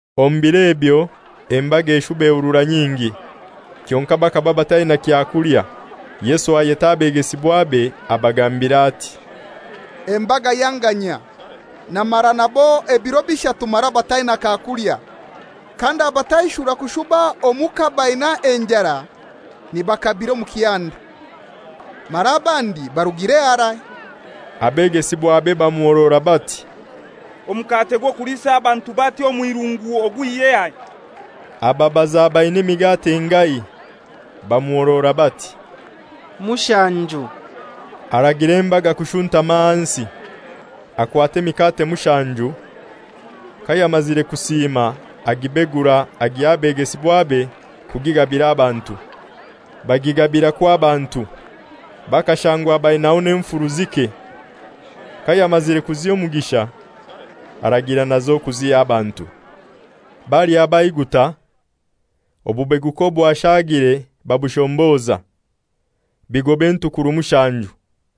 Omu biro ebyo embaga eshuba ehurura nyingi. Kyonkai bakaba bataina kyakulya. Yesu ayeta abegesibwabe abagambira ati, «Embaga yanganyia. Namara nabo ebiro bishatu mara bataina kakulya. Kandabataishura kushuba omuka baina enjara nibakabira omu kihanda, mara abandi barugire harai.» Abegesibwabe bamuhorora bati, «Omukate gw'okuliisa abantu bati omw'irungu ogwihyehai?» Ababaza baina emikate engahai. Bamuhorora bati, «Mushanju.» Aragira embaga kushuntama ahansi. Akwata emikate mushanju. Kayamazire kusiima agibegura agiha abegesibwabe kugigabira abantu. Bagigabirakwo abantu. Bakashangwa bainaho n'enfuru zike. Kayamazire kuziha omugisha, aragira nazo kuziha abantu. Balya baiguta, obubeguka obwashaagire babushomboza, bigoba entukuru mushanju.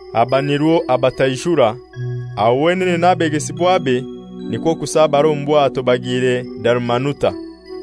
Aba nirwo abataishura, aho wenene n'abegesibwabe nikwo kusabara omu bwato bagiire Dalumanuta.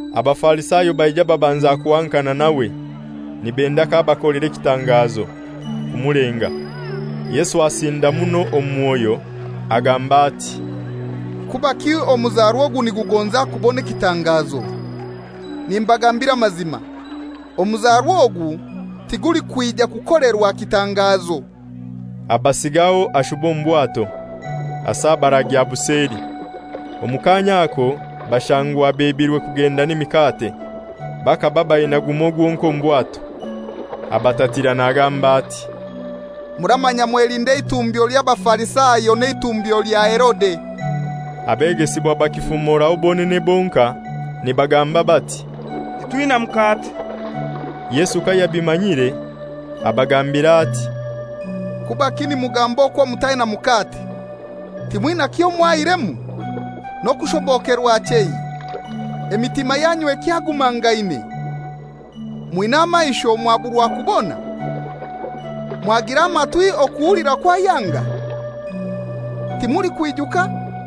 Abafarisayo baija babanza kuhankana nawe, nibenda k'abakolera ekitangazo, kumulenga. Yesu asinda muno omu mwoyo, agamba ati, «Kubaki omuzarwa ogu nigugonza kubona ekitangazo. Nimbagambira amazima, omuzarwa ogu tigulikwija kukolerwa kitangazo.» Abasiigaho ashuba omu bwato, asabara agya buseli. Omu kaanya ako bashangwa bebirwe kugenda n'emikate; bakaba baina gumoi gwonkai omu bwato. Abatatira nagamba ati, «Muramanya mwelinde eitumbyo ly'Abafarisayo n'eitumbyo lya Herode.» Abegesibwa bakifumoraho bonene bonkai nibagamba bati, «Titwina mukate.» Yesu kayabimanyire abagambira ati, «Kubaki nimugamba okwo mutaina mukate? Timwina kyomwaihiremu, n'okushobokerwa chei? Emitima yanyu ekyagumangaine? Mwina amaisho mwaburwa kubona, mwagira amatwi okuhulira kwayanga? Timulikwijuka?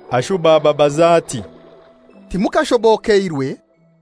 Ashuba ababaza ati, «Timukashobokeirwe?»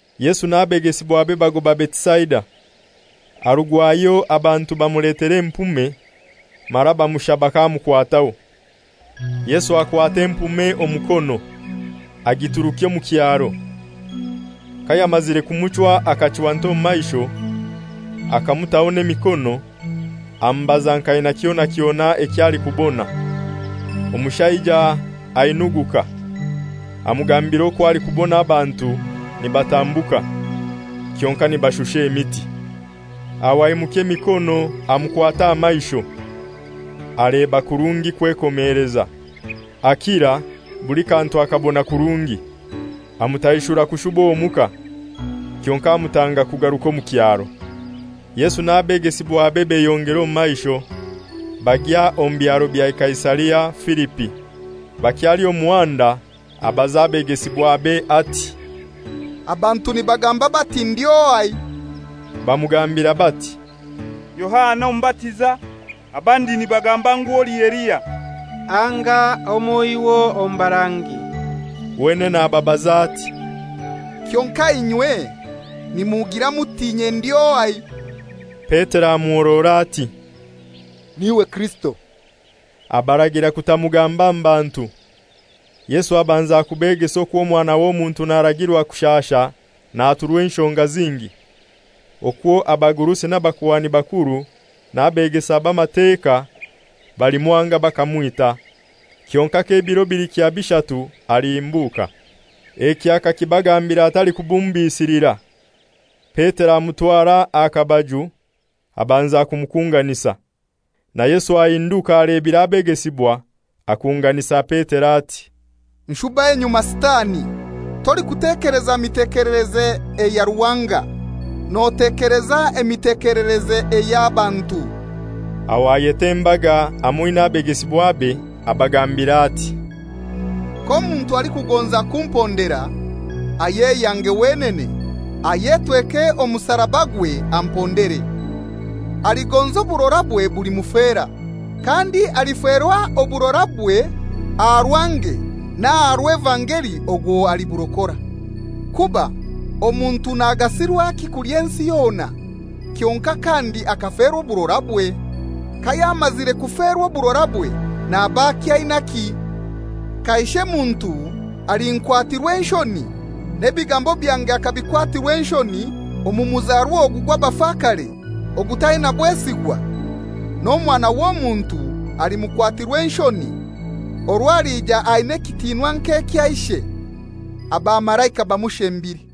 Yesu n'abegesibwabe bagoba Betisaida. Arugwayo abantu bamuletera empume, mara bamushaba k'amukwataho. Yesu akwata empume omukono, agiturukya omu kyaro. Kayamazire kumuchwa akachwanta omu maisho, akamutaho n'emikono, amubaza nk'aina kyona kyona eky'alikubona. Omushaija ainuguka, amugambira okwo alikubona abantu nibatambuka, kyonkai nibashusha emiti. Aho atwara emikono amukwata aha maisho. Aleba kurungi kwekomeleza, akira, buli kantu akabona kurungi. Amutaishura kushuba omuka, kyonkai amutanga kugaruka omu kyaro. Yesu n'abegesibwabe beyongera omu maisho, bagya omu byaro bya Kaisaria Filipi. Bakyali omu muhanda abaza abegesibwabe ati, «Abantu nibagamba bati ndi ohai?» Bamugambira bati, «Yohana Omubatiza; abandi nibagamba ngu oli Eliya; anga omoiho omu barangi.» Wenene ababaza ati, «Kyonkai inywe nimugira muti inye ndi ohai?» Petero amuhorora ati, «N'iwe Kirisito.» Abaragira kutamugamba mu bantu. Yesu abanza kubegesa okwo Omwana w'Omuntu naragirwa kushasha naturwa enshonga zingi, okwo abagurusi n'abakuhani bakuru n'abegesa b'Amateka balimwanga bakamwita, kyonkai k'ebiro bilikya bishatu alihimbuka. Eki akakibagambira atalikubumbisilira. Petero amutwara aha kabaju abanza kumukunganisa. Na Yesu ahinduka alebire abegesibwa, akunganisa Petero ati, «Nshuba enyuma, Sitani! Tolikutekeleza mitekelereze eya Ruhanga, notekeleza emitekelereze ey'abantu.» Aho ayeta embaga hamoi n'abegesibwabe, abagambira ati, «K'omuntu alikugonza kumpondera, ayeyange wenene, ayetweke omusarabagwe ampondere. Aligonza oburorabwe bulimufera; kandi aliferwa oburorabwe aha rwange n'aha rw'evangeli ogwo aliburokora. Kuba omuntu nagasirwaki kulya ensi yona, kyonkai kandi akaferwa oburorabwe? Kayamazire kuferwa oburorabwe naba akyainaki? Kaishe muntu alinkwatirwa enshoni, n'ebigambo byange akabikwatirwa enshoni omu muzarwa ogu gw'abafakare ogutaina bwesigwa, n'Omwana w'Omuntu halimukwatirwa enshoni orwo alija aina ekitinwa nk'ekya Ishe, abamalaika bamushembire.»